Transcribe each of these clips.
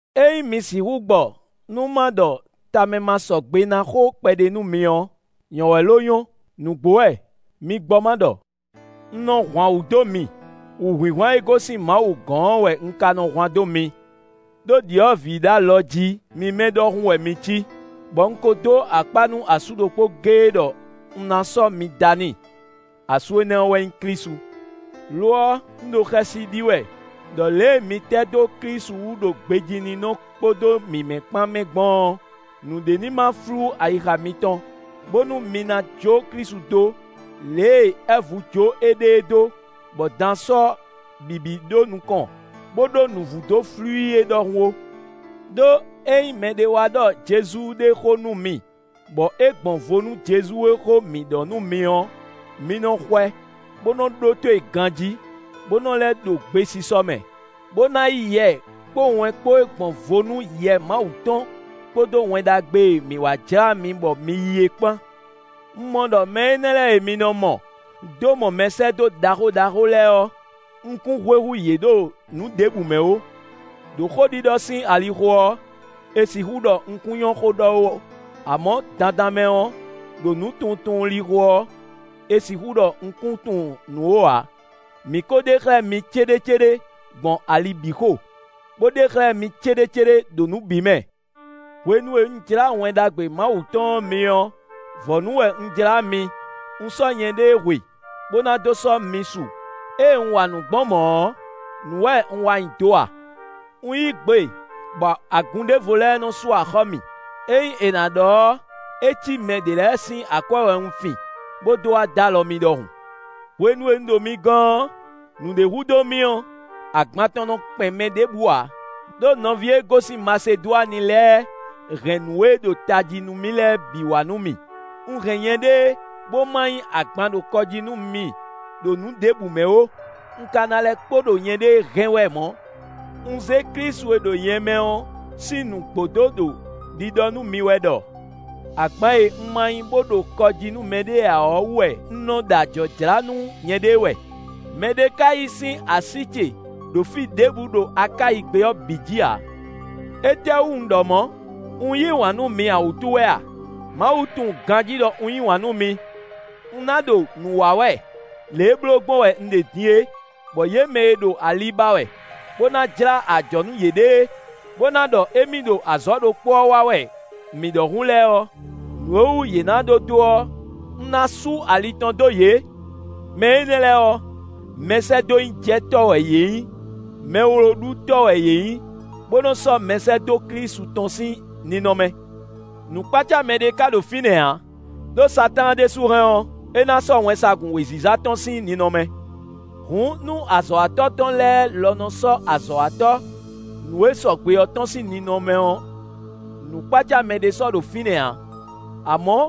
Ényí mi sixú gbɔ nú ma ɖɔ tamɛmasɔgbenánɔ xó kpɛɖé nú mi ɔ́, nyɔ́ wɛ lo nyɔ́. Nǔgbó wɛ! Mi gbɔ ma ɖɔ! Un nɔ hwan wǔ dó mi; wǔhwinhwan e gosín Mawu gɔ́n ɔ́ wɛ un ka nɔ hwan dó mi; ɖó ɖyɔ̌vǐ ɖo alɔjí mímɛ́ ɖɔhun wɛ mi cí, bɔ un ko dó akpá nú asú ɖokpó géé ɖɔ un ná sɔ́ mi da n'i; asú énɛ́ ɔ́ wɛ nyí Klísu. Lo ɔ́, un ɖo xɛsi ɖi wɛ ɖɔ lě e mi tɛ́ dó Klísu wú ɖo gbejíninɔ kpódó mǐmɛ́ kpán mɛ gbɔn ɔ́, nǔɖé ní ma flú ayixa mitɔn, bónú mi ná jó Klísu dó, lě e Ɛvu jó éɖée dó, bɔ dan sɔ́ bǐbí ɖó nukɔn, bó ɖó nǔvú dó flú i é ɖɔhun ó. Đó ényí mɛɖé wá ɖɔ Jezu ɖé xó nú mi bɔ é gbɔn vo nú Jezu e xó mǐ ɖɔ nú mi ɔ́, mi nɔ xwɛ bó nɔ́ ɖótó e ganjí, bó nɔ́ lɛ́ ɖo gbesisɔ mɛ, bó ná yí yɛ kpó wɛn kpó e gbɔn vo nú Yɛ Mawu tɔn kpódó Wɛn Ɖagbe e mǐ wa jlá mi bɔ mi yí é kpán. Un mɔ ɖɔ mɛ énɛ́ lɛ́ɛ e mi nɔ mɔ dó mɔ mɛsɛ́dó ɖaxó ɖaxó lɛ́ɛ ɔ́, un kún hwe hú yě ɖo nǔ ɖěbǔ mɛ ó. Đo xóɖiɖɔ sín alixo ɔ́, è sixú ɖɔ un kún nyɔ́ xó ɖɔ ó; amɔ̌ dandan mɛ ɔ́, ɖo nǔtunwuntunwun lixo ɔ́, è sixú ɖɔ un kún tunwun nǔ ó ǎ; mǐ ko ɖe xlɛ́ mi céɖécéɖé gbɔn ali bǐ xo, bó ɖe xlɛ́ mi céɖécéɖé ɖo nǔ bǐ mɛ. Hwenu e un jlá Wɛn Ɖagbe Mawu tɔn ɔ́ mi ɔ́, vɔ̌nu wɛ un jlá mi; un sɔ́ nyɛɖée hwe, bó ná dó sɔ́ mi su. Ée un wa nǔ gbɔn mɔ̌ ɔ́, nǔ wɛ un wa nyi do a? Un yí gbe bɔ agun ɖěvo lɛ́ɛ nɔ sú axɔ́ mì; ényí è nǎ ɖɔ ɔ́, é cí mɛ ɖě lɛ́ɛ sín akwɛ́ wɛ un fin, bó dó wá dó alɔ mi ɖɔhun. Hwenu e un ɖo mi gɔ́n ɔ́, nǔɖé hú dó mì ɔ́, agban tɔn nɔ kpɛn mɛ ɖěbǔ ǎ, ɖó nɔví e gosín Masedwani lɛ́ɛ hɛn nǔ e ɖo tají nú mì lɛ́ɛ bǐ wá nú mì. Un hɛn nyɛɖée bó ma nyí agban ɖo kɔ jí nú mi ɖo nǔ ɖěbǔ mɛ ó; un ka ná lɛ́ kpo ɖo nyɛɖée hɛn wɛ mɔ̌. Un zé Klísu e ɖo nyɛ mɛ ɔ́ sín nǔgbó dó ɖo ɖiɖɔ nú mi wɛ ɖɔ agban e un ma nyí bó ɖo kɔ jí nú mɛɖé ǎ ɔ́ wú wɛ un nɔ ɖo ajɔ̌ jlá nú nyɛɖée wɛ; mɛɖé ka yí sín así ce ɖo fí ɖěbǔ ɖo Akáyi gbé ɔ́ bǐ jí ǎ. Étɛ́wú un ɖɔ mɔ̌? Un yí wǎn nú mi ǎ wútu wɛ a? Mawu tunwun ganjí ɖɔ un yí wǎn nú mi. Un ná ɖo nǔ wa wɛ lě e bló gbɔn wɛ un ɖe din é, bɔ yě mɛ e ɖo ali ba wɛ, bó ná jlá ajɔ̌ nú yěɖée, bó ná ɖɔ émí ɖo azɔ̌ ɖokpó ɔ́ wa wɛ mǐ ɖɔhun lɛ́ɛ ɔ́, nǔ e wú yě ná ɖó dó ɔ́, un ná sú ali tɔn dó yě. Mɛ énɛ́ lɛ́ɛ ɔ́, mɛsɛ́dónyíjɛtɔ́ wɛ yě nyí; mɛwlóɖutɔ́ wɛ yě nyí, bó nɔ́ sɔ́ mɛsɛ́dó Klísu tɔn sín ninɔmɛ. Nǔkpácámɛ ɖé ka ɖo fínɛ́ ǎ, ɖó Satáan ɖésú hɛn ɔ́, é ná sɔ́ wɛnsagun wěziza tɔn sín ninɔmɛ. Hǔn nú azɔ̌watɔ́ tɔn lɛ́ɛ lɔ nɔ sɔ́ azɔ̌watɔ́ nǔ e sɔgbe ɔ́ tɔn sín ninɔmɛ ɔ́, nǔkpácámɛ ɖé sɔ́ ɖo fínɛ́ ǎ; amɔ̌,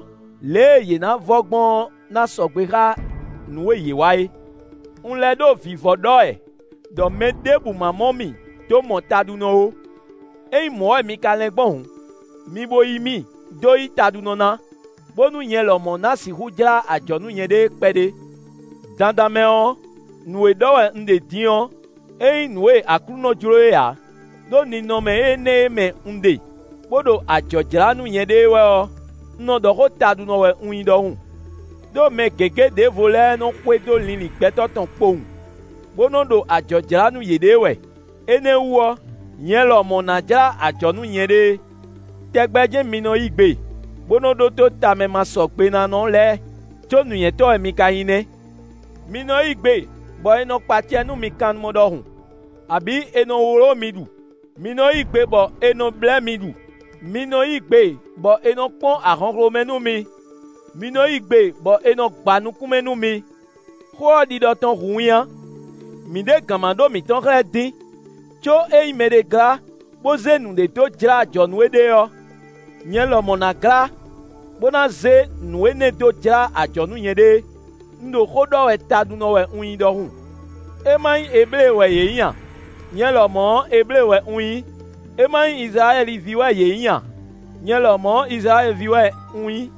lě e yě ná vɔ gbɔn ɔ́ ná sɔgbe xá nǔ e yě wa é. Un lɛ́ ɖo vǐvɔ́ ɖɔ wɛ ɖɔ mɛ ɖěbǔ má mɔ mì dó mɔ taɖunɔ ó; ényí mɔ̌ wɛ mi ka lɛ́n gbɔn hǔn, mi bo yí mì dó yí taɖunɔ ná, bónú nyɛ lɔmɔ̌ ma sixú jlá ajɔ̌ nú nyɛɖée kpɛɖé. Dandan mɛ ɔ́, nǔ e ɖɔ wɛ un ɖe din ɔ́, é nyí nǔ e Aklúnɔ jló é ǎ; ɖó ninɔmɛ énɛ́ e mɛ un ɖe, bó ɖo ajɔ̌ jlá nú nyɛɖée wɛ ɔ́, un nɔ ɖɔ xó taɖunɔ wɛ un nyí ɖɔhun. Đó mɛ gěgé ɖěvo lɛ́ɛ nɔ xwedó linlin gbɛtɔ́ tɔn kpowun, bó nɔ ɖo ajɔ̌ jlá nú yěɖée wɛ; énɛ́ wú ɔ́, nyɛ lɔmɔ̌ ná jlá ajɔ̌ nú nyɛɖée. Tɛgbɛ jɛ́n mi nɔ yí gbe, bó nɔ ɖótó tamɛmasɔgbenánɔ lɛ́ɛ; có nǔnywɛ́tɔ́ wɛ mi ka nyí nɛ́! Mi nɔ yí gbe, bɔ è nɔ kpa acɛ nú mi kannumɔ ɖɔhun, abǐ è nɔ wló mi ɖu; mi nɔ yí gbe bɔ è nɔ blɛ́ mi ɖu; mi nɔ yí gbe bɔ è nɔ kpɔ́n ahɔnxlomɛ nú mi; mi nɔ yí gbe bɔ è nɔ gba nukún mɛ nú mi. Xó ɔ́, ɖiɖɔ tɔn hu winnyá: mǐ ɖe gǎnmaɖó mǐtɔn xlɛ́ dín. Có ényí mɛɖé glá, bó zé nǔɖé dó jlá ajɔ̌ nú éɖée ɔ́, nyɛ lɔmɔ̌ ná glá, bó ná zé nǔ énɛ́ dó jlá ajɔ̌ nú nyɛɖée. (Un ɖo xó ɖɔ wɛ taɖunɔ wɛ un nyí ɖɔhun.) É ma nyí Eblée wɛ yě nyí a? Nyɛ lɔmɔ̌ ɔ́, Eblée wɛ un nyí. É ma nyí Izlayɛ́li ví wɛ yě nyí a? Nyɛ lɔmɔ̌ ɔ́, Izlayɛ́li ví wɛ un nyí.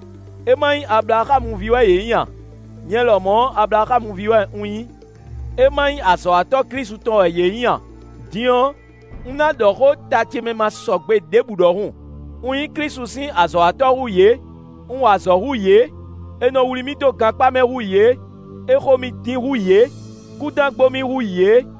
É ma nyí Ablaxámu ví wɛ nyí a? Nyɛ lɔmɔ̌ ɔ́, Ablaxámu ví wɛ un nyí. É ma nyí azɔ̌watɔ́ Klísu tɔn wɛ yě nyí a? Din ɔ́, un ná ɖɔ xó ta ce mɛ ma sɔgbe ɖěbǔ ɖɔhun: un nyí Klísu sín azɔ̌watɔ́ hú yě; un wa azɔ̌ hú yě; è nɔ wlí mì dó gankpá mɛ hú yě; è xo mì dín hú yě; kúdán gbo mì hú yě.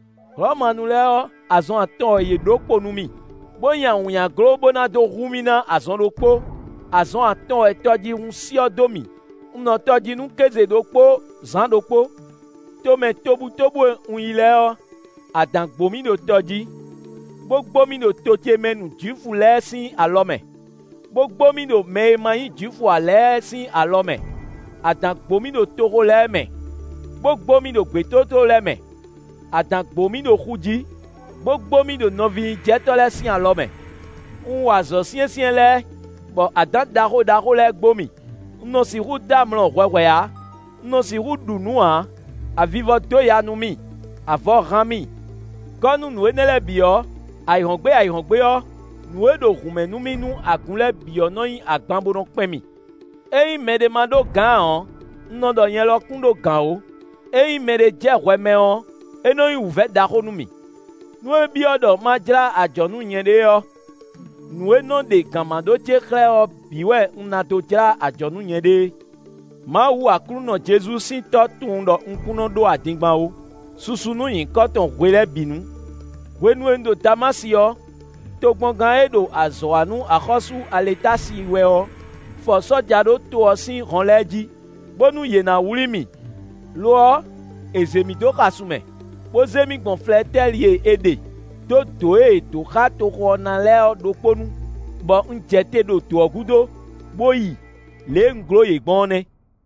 Hlɔ̌manu lɛ́ɛ ɔ́, azɔn atɔn wɛ yě ɖǒ kpo nú mì, bó nyi awǐnnyaglo bó ná dó hu mì ná azɔn ɖokpó; azɔn atɔn wɛ tɔjíhún syɔ́ dó mì; un nɔ tɔ jí nú kéze ɖokpó zǎn ɖokpó. Tomɛ tobutóbú e un yi lɛ́ɛ ɔ́, adǎn gbo mì ɖo tɔ jí, bó gbo mì ɖo to ce mɛ nu Jwifu lɛ́ɛ sín alɔ mɛ, bó gbo mì ɖo mɛ e ma nyí Jwifu ǎ lɛ́ɛ sín alɔ mɛ; adǎn gbo mì ɖo toxo lɛ́ɛ mɛ, bó gbo mì ɖo gbětótló lɛ́ɛ mɛ; adǎn gbo mì ɖo xu jí, bó gbo mì ɖo nɔvínyíjɛtɔ́ lɛ́ɛ sín alɔ mɛ. Un wa azɔ̌ syɛ́nsyɛ́n lɛ́ɛ, bɔ adǎn ɖaxó ɖaxó lɛ́ɛ gbo mì; un nɔ sixú dɔ́ amlɔ hwɛhwɛ ǎ; un nɔ sixú ɖu nǔ ǎ; avivɔ dó ya nú mì; avɔ hán mì. Gɔ́ nú nǔ énɛ́ lɛ́ɛ bǐ ɔ́, ayǐhɔ́ngbe ayǐhɔ́ngbe ɔ́, nǔ e ɖo hǔnmɛ nú mì nú agun lɛ́ɛ bǐ ɔ́ nɔ nyí agban bó nɔ́ kpɛn mì. Ényí mɛɖé ma ɖó gǎn ǎ ɔ́, un nɔ ɖɔ nyɛ lɔ kún ɖó gǎn ó; ényí mɛɖé jɛ hwɛ mɛ ɔ́, é nɔ nyí wǔvɛ́ ɖaxó nú mì. Nú é byɔ́ ɖɔ ma jlá ajɔ̌ nú nyɛɖée ɔ́, nǔ e nɔ ɖe gǎnmaɖó ce xlɛ́ ɔ́ bǐ wɛ un ná dó jlá ajɔ̌ nú nyɛɖée. Mawu Aklúnɔ Jezu sín Tɔ́ tunwun ɖɔ un kún nɔ ɖó adingban ó. Susu nú nyǐkɔ tɔn hwe lɛ́ɛ bǐ nu! Hwenu e un ɖo Damási ɔ́, tokpɔngán e ɖo azɔ̌ wa nú axɔ́sú Aletási wɛ ɔ́ fɔ sɔ́ja ɖó to ɔ́ sín hɔn lɛ́ɛ jí, bónú yě ná wlí mì. Lo ɔ́, è zě mì dó xasun mɛ, bó zé mì gbɔn flɛtɛ́li e è ɖe dó dǒ e è do xá toxo ɔ́ ná lɛ́ɛ ɖokpó nu, bɔ un jɛ te ɖo dǒ ɔ́ gúdo, bó yi; lě e un gló yě gbɔn ɔ́ nɛ́.